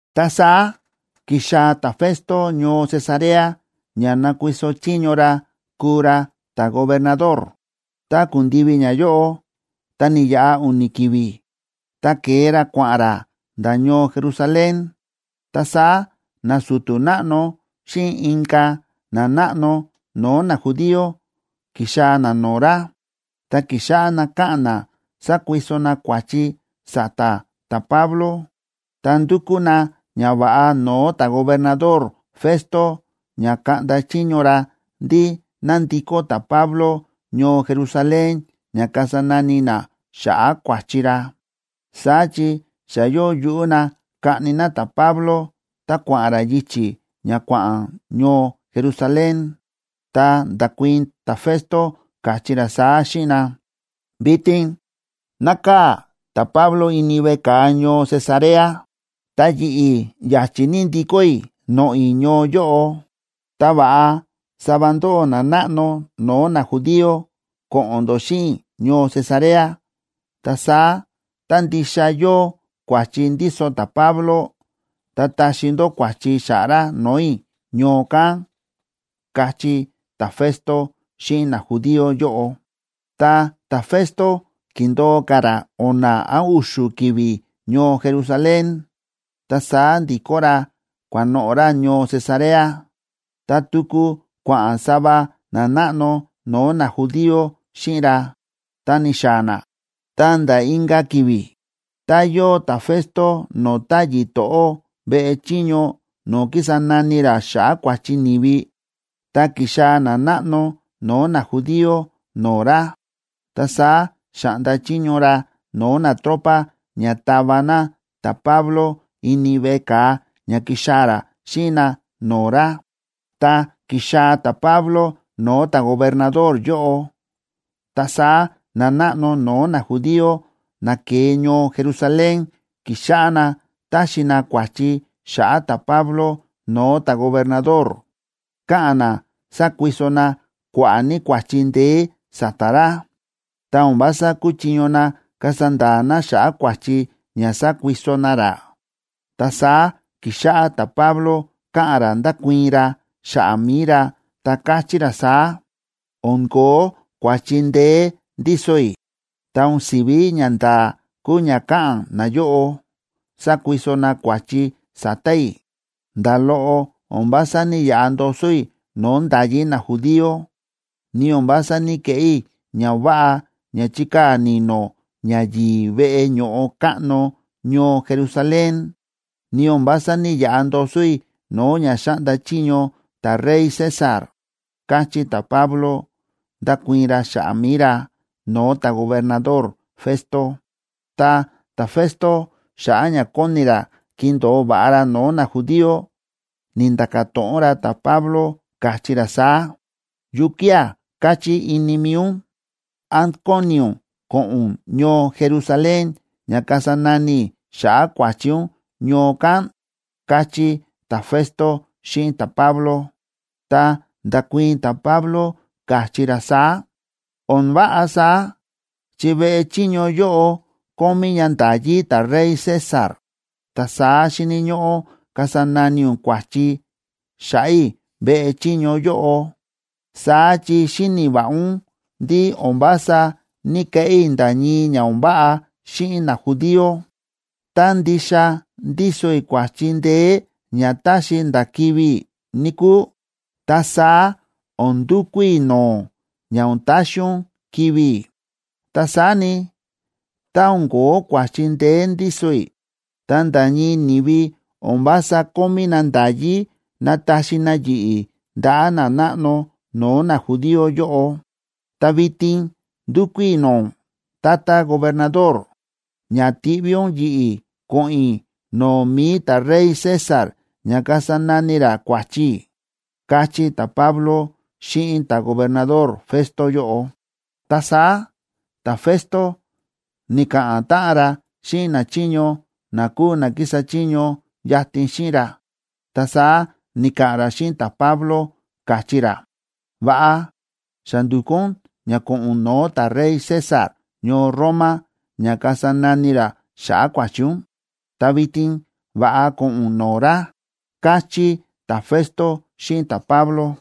Ta saá ki̱xaa̱ ta̱Festo ñoo Cesarea ña nakuiso chiño ra kuu ra ta̱gobernador. Tá ku̱ndivi ñayóꞌo, ta ni̱yaꞌa u̱ni̱ ki̱vi̱, ta ke̱e ra kua̱ꞌa̱n ra nda̱ ñoo Jerusalén. Ta saá nasu̱tu̱ náꞌno xíꞌin inka̱ nanáꞌno no̱o̱ najudío ki̱xaa̱ na no̱o̱ ra, ta ki̱xáꞌá na káꞌa̱n na sákuiso na kua̱chi sa̱ta̱ ta̱Pablo. Ta ndu̱kú na ñava̱ꞌa no̱o̱ ta̱gobernador Festo ña kaꞌnda chiño ra ndí ná ndikó ta̱Pablo ñoo Jerusalén ña kasa nani na xa̱ꞌa̱ kua̱chi ra. Saá chi xa yóo yuꞌú na kaꞌni na ta̱Pablo tá kua̱ꞌa̱n ra yichi̱ ña kua̱ꞌa̱n ñoo Jerusalén. Ta nda̱kuii̱n ta̱Festo káchí ra saá xíꞌin na: ―Vitin nákaa̱ ta̱Pablo ini veꞌe ka̱a ñoo Cesarea. Ta yi̱ꞌi̱ ya̱chi̱ ní ndikó i̱ noꞌo̱ i̱ ñoo yóꞌo. Ta va̱ꞌa sava ndóꞌó nanáꞌno no̱o̱ najudío ko̱ꞌo̱n ndó xíꞌin i̱ ñoo Cesarea. Ta saá tá ndixa yóo kua̱chi ndíso ta̱Pablo, ta taxi ndó kua̱chi xa̱ꞌa̱ ra no̱o̱ i̱ ñoo kán ―káchí ta̱Festo xíꞌin najudío yóꞌo. Ta ta̱Festo ki̱ndo̱o ka̱ ra o̱na̱ án u̱xu̱ ki̱vi̱ ñoo Jerusalén, ta saá ndi̱kó ra kua̱noꞌo̱ ra ñoo Cesarea, ta tuku kua̱ꞌa̱n sava nanáꞌno no̱o̱ najudío xíꞌin ra, ta ni̱xaa̱ na. Ta nda̱ inka̱ ki̱vi̱, ta yóo ta̱Festo no̱o̱ táyi̱ to̱ꞌó veꞌe chiño no̱o̱ kísa nani ra xa̱ꞌa̱ kua̱chi ni̱vi. Tá ki̱xaa̱ nanáꞌno no̱o̱ najudío no̱o̱ ra, ta saá xa̱ꞌnda chiño ra no̱o̱ natropa ña tava na ta̱Pablo ini veꞌe ka̱a ña kixaa̱ ra xíꞌin na no̱o̱ ra. Tá ki̱xaa̱ ta̱Pablo no̱o̱ ta̱gobernador yóꞌo, ta saá nanáꞌno no̱o̱ najudío na ke̱e ñoo Jerusalén ki̱xáꞌá na táxi na kua̱chi xa̱ꞌa̱ ta̱Pablo no̱o̱ ta̱gobernador. Káꞌa̱n na sákuiso na kua̱ꞌa̱ ní kua̱chi ndeé sa̱ta̱ ra, ta o̱n vása kúchiño na kasa nda̱a̱ na xa̱ꞌa̱ kua̱chi ña sákuiso na ra. Ta saá ki̱xáꞌá ta̱Pablo káꞌa̱n ra ndákuii̱n ra xa̱ꞌa̱ mi̱i ra, ta káchí ra saá: ―O̱n ko̱ó kua̱chi ndeé ndíso i̱, ta o̱n si̱ví ñanda̱a̱ kúu ña káꞌa̱n nayóꞌo, sákuiso na kua̱chi sa̱ta̱ i̱. Nda̱ loꞌo o̱n vása ní‑yaꞌa ndoso i̱ no̱o̱ nda̱yí najudío, ni o̱n vása ní‑keꞌé i̱ ña o̱n váꞌa ña chíkaa̱ ni̱no̱ ñayi̱i̱ veꞌe ño̱ꞌo káꞌno ñoo Jerusalén, ni o̱n vása ní‑yaꞌa ndoso i̱ no̱o̱ ña xáꞌnda chiño ta̱rey César ―káchí ta̱Pablo, nda̱kuii̱n ra xa̱ꞌa̱ mi̱i ra no̱o̱ ta̱gobernador Festo. Ta ta̱Festo, xa̱ꞌa̱ ña kóni ra kindo̱o va̱ꞌa ra no̱o̱ najudío, ni̱nda̱ka̱ to̱ꞌon ra ta̱Pablo, káchí ra saá: ―¿Yukía̱ káchí ini mi̱i ún? ¿Án kóni ún ko̱ꞌo̱n ún ñoo Jerusalén ña kasa nani i̱ xa̱ꞌa̱ kua̱chi ún ñoo kán? ―káchí ta̱Festo xíꞌin ta̱Pablo. Ta nda̱kuii̱n ta̱Pablo káchí ra saá: ―O̱n váꞌa saá, chi veꞌe chiño yóꞌo kómí ña nda̱yí ta̱rey César, ta saá xíni̱ ñóꞌó kasa nani ún kua̱chi xa̱ꞌa̱ i̱ veꞌe chiño yóꞌo. Saá chi xíni̱ va̱ꞌa ún ndí o̱n vása ní‑keꞌé i̱ nda̱ ñii ña o̱n váꞌa xíꞌin najudío. Tá ndixa ndíso i̱ kua̱chi ndeé ña táxi nda̱ kivi̱ i̱, níkúu, ta saá o̱n ndukú i̱ no̱o̱ ún ña o̱n taxi ún kivi̱ i̱. Ta saá ni, tá o̱n ko̱ó kua̱chi ndeé ndíso i̱, ta nda̱ ñii ni̱vi o̱n vása kómí na nda̱yí nataxi na yi̱ꞌi̱ ndaꞌa̱ nanáꞌno no̱o̱ najudío yóꞌo. Ta vitin ndúkú i̱ no̱o̱ ún, tata gobernador, ña tiꞌví ún yi̱ꞌi̱ ko̱ꞌo̱n i̱ no̱o̱ mi̱i ta̱rey César ña kasa nani ra kua̱chi i̱ ―káchí ta̱Pablo xíꞌin ta̱gobernador Festo yóꞌo. Ta saá ta̱Festo ni̱ka̱ꞌa̱n táꞌan ra xíꞌin nachiño na kúu na kísa chiño yatin xíꞌin ra, ta saá ni̱ka̱ꞌa̱n ra xíꞌin ta̱Pablo, káchí ra: ―Va̱ꞌa, xa ndu̱kú ún ña ko̱ꞌo̱n ún no̱o̱ ta̱rey César ñoo Roma ña kasa nani ra xa̱ꞌa̱ kua̱chi ún, ta vitin va̱ꞌa ko̱ꞌo̱n ún no̱o̱ ra ―káchí ta̱Festo xíꞌin ta̱Pablo.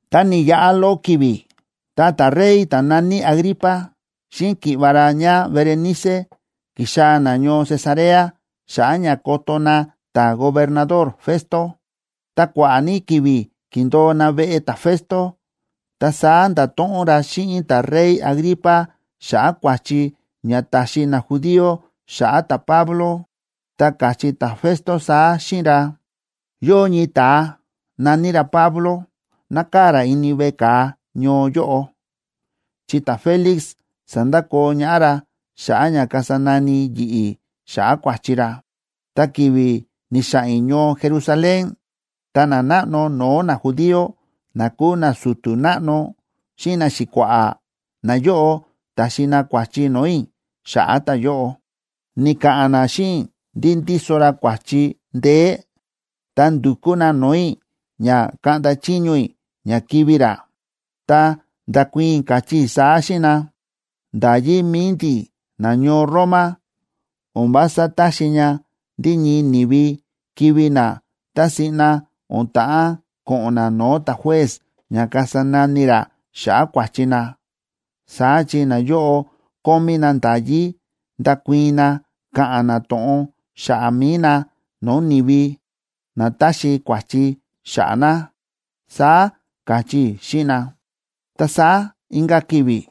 Ta ni̱yaꞌa loꞌo ki̱vi̱, ta ta̱rey ta̱ na̱ní Agripa xíꞌin ki̱ꞌva̱ ra ñáBerenice ki̱xaa̱ na ñoo Cesarea xa̱ꞌa̱ ña koto na ta̱gobernador Festo. Ta kua̱ꞌa̱ ní ki̱vi̱ ki̱ndo̱o na veꞌe ta̱Festo, ta saá nda̱to̱ꞌon ra xíꞌin ta̱rey Agripa xa̱ꞌa̱ kua̱chi ña táxi najudío xa̱ꞌa̱ ta̱Pablo, ta káchí ta̱Festo saá xíꞌin ra: ―Yóo ñii ta̱a na̱ní ra Pablo, nákaa̱ ra ini veꞌe ka̱a ñoo yóꞌo, chi ta̱Félix sa̱ndakoo ñaꞌá ra xa̱ꞌa̱ ña kasa nani yi̱ꞌi̱ xa̱ꞌa̱ kua̱chi ra. Ta ki̱vi̱ ni̱xa̱ꞌa̱n i̱ ñoo Jerusalén, ta nanáꞌno no̱o̱ najudío, na kúu nasu̱tu̱ náꞌno xíꞌin naxi̱kua̱ꞌa̱, nayóꞌo ta̱xi na kua̱chi no̱o̱ i̱ xa̱ꞌa̱ ta̱yóꞌo. Ni̱ka̱ꞌa̱n na xíꞌin i̱ ndí ndíso ra kua̱chi ndeé, ta ndu̱kú na no̱o̱ i̱ ña kaꞌnda chiño i̱ ña kivi̱ ra. Ta nda̱kuii̱n i̱ káchí i̱ saá xíꞌin na: “Nda̱yí mi̱i ndi̱ nañoo Roma o̱n vása táxi ña ndí ñii ni̱vi kivi̱ na tá siꞌna o̱n ta̱ꞌán ko̱ꞌo̱n na no̱o̱ ta̱juez ña kasa nani ra xa̱ꞌa̱ kua̱chi na. Saá chi nayóꞌo kómí na nda̱yí ndakuii̱n na ka̱ꞌa̱n na to̱ꞌon xa̱ꞌa̱ mi̱i na no̱o̱ ni̱vi na táxi kua̱chi xa̱ꞌa̱ na”, saá káchí i̱ xíꞌin na. Ta saá inka̱ ki̱vi̱,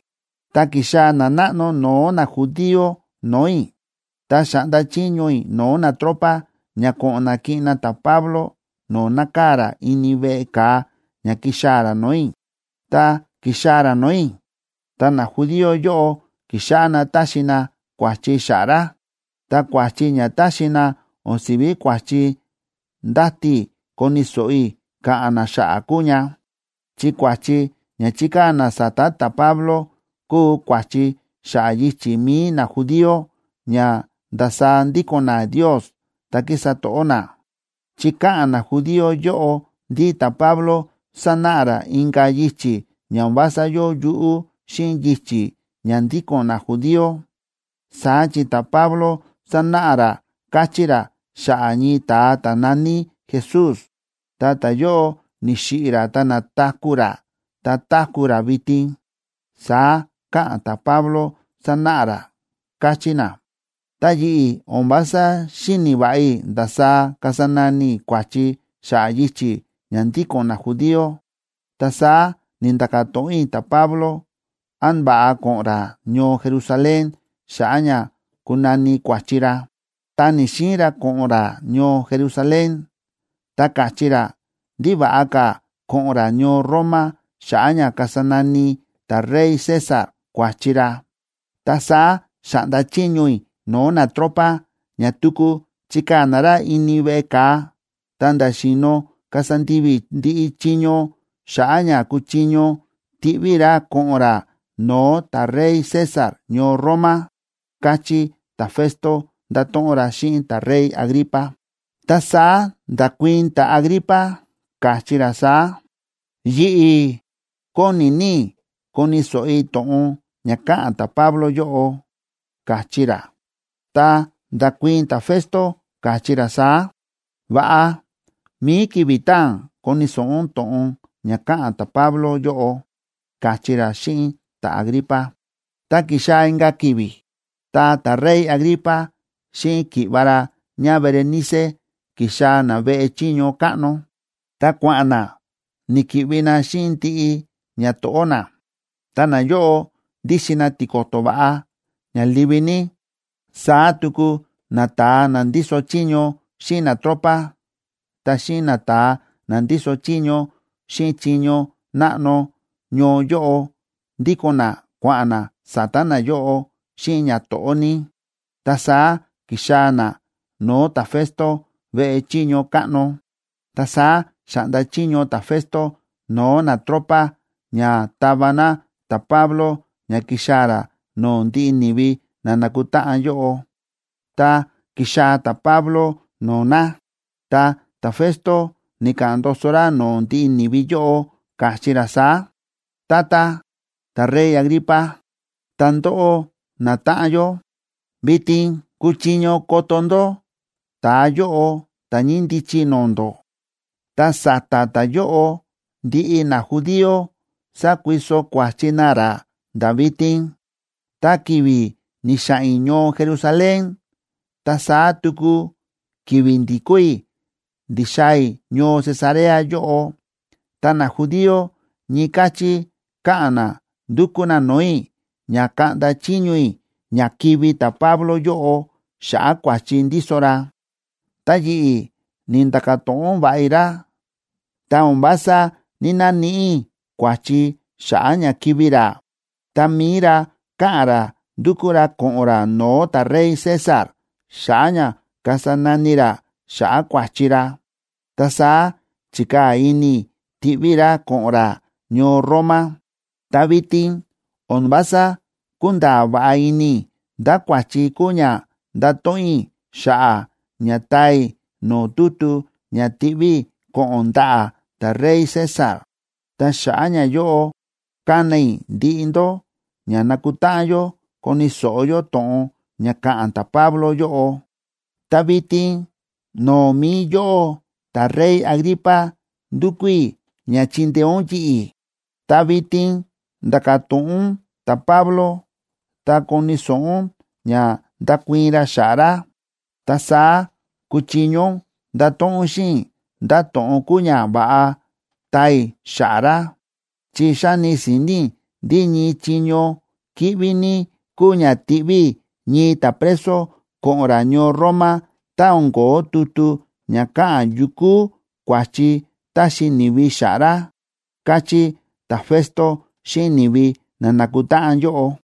ta ki̱xaa̱ nanáꞌno no̱o̱ najudío no̱o̱ i̱, ta xa̱ꞌnda chiño i̱ no̱o̱ natropa ña ko̱ꞌo̱n na kiꞌin na ta̱Pablo no̱o̱ nákaa̱ ra ini veꞌe ka̱a ña kixaa̱ ra no̱o̱ i̱. Tá ki̱xaa̱ ra no̱o̱ i̱, ta najudío yóꞌo ki̱xáꞌá na táxi na kua̱chi xa̱ꞌa̱ ra. Ta kua̱chi ña táxi na o̱n si̱ví kua̱chi ndáti i̱ koni̱ so̱ꞌo i̱ ka̱ꞌa̱n na xa̱ꞌa̱ kúu ña, chi kua̱chi ña chíkaa̱ na sa̱ta̱ ta̱Pablo kúu kua̱chi xa̱ꞌa̱ yichi̱ mi̱i najudío ña ndasaá ndíko̱n na Ndios ta̱ kísa to̱ꞌó na, chi káꞌa̱n najudío yóꞌo ndí ta̱Pablo sánáꞌa ra inka̱ yichi̱ ña o̱n vása yóo yuꞌú xíꞌin yichi̱ ña ndíko̱n najudío. Saá chi ta̱Pablo sánáꞌa ra káchí ra xa̱ꞌa̱ ñii ta̱a ta̱ na̱ní Jesús, ta ta̱yóꞌo ni̱xiꞌi̱ ra ta na̱taku̱ ra ta táku̱ ra vitin, saá káꞌa̱n ta̱Pablo, sánáꞌa ra, káchí na. Ta yi̱ꞌi̱ o̱n vása xíni̱ va̱ꞌa i̱ ndasaá kasa nani i̱ kua̱chi xa̱ꞌa̱ yichi̱ ña ndíko̱n najudío, ta saá ni̱nda̱ka̱ to̱ꞌon i̱ ta̱Pablo án va̱ꞌa ko̱ꞌo̱n ra ñoo Jerusalén xa̱ꞌa̱ ña kunani kua̱chi ra. Ta ni̱‑xiin ra ko̱ꞌo̱n ra ñoo Jerusalén, ta ka̱chí ra ndí va̱ꞌa ka̱ ko̱ꞌo̱n ra ñoo Roma xa̱ꞌa̱ ña kasa nani ta̱rey César kua̱chi ra. Ta saá xa̱ꞌnda chiño i̱ no̱o̱ natropa ña tuku chikaa̱ na ra ini veꞌe ka̱a ta̱nda̱ xi̱no̱ kasa ndivi i̱ ndiꞌi chiño xa̱ꞌa̱ ña kuchiño tiꞌví i̱ ra ko̱ꞌo̱n ra no̱o̱ ta̱rey César ñoo Roma ―káchí ta̱Festo, nda̱to̱ꞌon ra xíꞌin ta̱rey Agripa. Ta saá nda̱kuii̱n ta̱Agripa, káchí ra saá: ―Yi̱ꞌi̱, kóni ní i̱ koni̱ so̱ꞌo i̱ to̱ꞌon ña ka̱ꞌa̱n ta̱Pablo yóꞌo ―káchí ra. Ta nda̱kuii̱n ta̱Festo, káchí ra saá: ―Va̱ꞌa, mi̱i ki̱vi̱ taa̱n koni̱ so̱ꞌo ún to̱ꞌon ña ka̱ꞌa̱n ta̱Pablo yóꞌo ―káchí ra xíꞌin ta̱Agripa. Ta ki̱xaa̱ inka̱ ki̱vi̱, ta ta̱rey Agripa xíꞌin ki̱ꞌva̱ ra ñáBerenice ki̱xaa̱ na veꞌe chiño káꞌno, ta kua̱ꞌa̱n na ni̱ki̱ꞌvi na xíꞌin ndiꞌi ñato̱ꞌó na, ta nayóꞌo ndíxin na tiko̱to̱ va̱ꞌa ña livi ní. Saá tuku nata̱a na ndíso chiño xíꞌin natropa, ta xíꞌin nata̱a na ndíso chiño xíꞌin chiño náꞌno ñoo yóꞌo ndíko̱n na kua̱ꞌa̱n na sa̱ta̱ nayóꞌo xíꞌin ñato̱ꞌó ní, ta saá ki̱xaa̱ na no̱o̱ ta̱Festo veꞌe chiño káꞌno. Ta saá xa̱ꞌnda chiño ta̱Festo no̱o̱ natropa ña tava na ta̱Pablo ña kixaa̱ ra no̱o̱ ndiꞌi ni̱vi na nákutáꞌan yóꞌo. Tá ki̱xaa̱ ta̱Pablo no̱o̱ na, ta ta̱Festo ni̱ka̱ꞌa̱n ndoso ra no̱o̱ ndiꞌi ni̱vi yóꞌo, káchí ra saá: ―Tata, ta̱rey Agripa, ta ndóꞌó natáꞌan yó, vitin kúchiño koto ndó ta̱a yóꞌo ta̱ ñíndichi no̱o̱ ndó. Ta sa̱ta̱ ta̱yóꞌo ndiꞌi najudío sákuiso kua̱chi na ra nda̱ vitin. Tá ki̱vi̱ ni̱xa̱ꞌa̱n i̱ ñoo Jerusalén ta saá tuku ki̱vi̱ ndi̱kó i̱ ndi̱xaa̱ i̱ ñoo Cesarea yóꞌo, ta najudío ñii káchí káꞌa̱n na ndúkú na no̱o̱ i̱ ña kaꞌnda chiño i̱ ña kivi̱ ta̱Pablo yóꞌo xa̱ꞌa̱ kua̱chi ndíso ra. Ta yi̱ꞌi̱, ni̱nda̱ka̱ to̱ꞌon va̱ꞌa i̱ ra, ta o̱n vása ní‑naníꞌi i̱ kua̱chi xa̱ꞌa̱ ña kivi̱ ra. Ta mi̱i ra káꞌa̱n ra ndúkú ra ko̱ꞌo̱n ra no̱o̱ ta̱rey César xa̱ꞌa̱ ña kasa nani ra xa̱ꞌa̱ kua̱chi ra. Ta saá chi̱kaa̱ ini i̱ tiꞌví i̱ ra ko̱ꞌo̱n ra ñoo Roma. Ta vitin o̱n vása kúnda̱a̱ va̱ꞌa ini i̱ ndá kua̱chi kúu ña ndato̱ꞌon i̱ xa̱ꞌa̱ ña taa i̱ no̱o̱ tutu ña tiꞌví i̱ ko̱ꞌo̱n ndaꞌa̱ ta̱rey César. Ta xa̱ꞌa̱ ñayóꞌo ka̱na i̱ ndiꞌi ndó ña nakutáꞌan yó koni̱ so̱ꞌo yó to̱ꞌon ña ka̱ꞌa̱n ta̱Pablo yóꞌo. Ta vitin no̱o̱ mi̱i yóꞌó ta̱rey Agripa, ndúkú i̱ ña chindeé ún yi̱ꞌi̱. Ta vitin nda̱ka̱ to̱ꞌon ún ta̱Pablo, ta koni̱ so̱ꞌo ún ña ndakuii̱n ra xa̱ꞌa̱ ra, ta saá kuchiño ún ndato̱ꞌon ún xíꞌin i̱ ndá to̱ꞌon kúu ña va̱ꞌa taa i̱ xa̱ꞌa̱ ra. Chi xáni si̱ni̱ i̱ ndí ñii chiño kíꞌví ní kúu ña tiꞌví i̱ ñii ta̱preso ko̱ꞌo̱n ra ñoo Roma tá o̱n ko̱ó tutu ña káꞌa̱n yu kúu kua̱chi táxi ni̱vi xa̱ꞌa̱ ra ―káchí ta̱Festo xíꞌin ni̱vi na nákutáꞌan yóꞌo.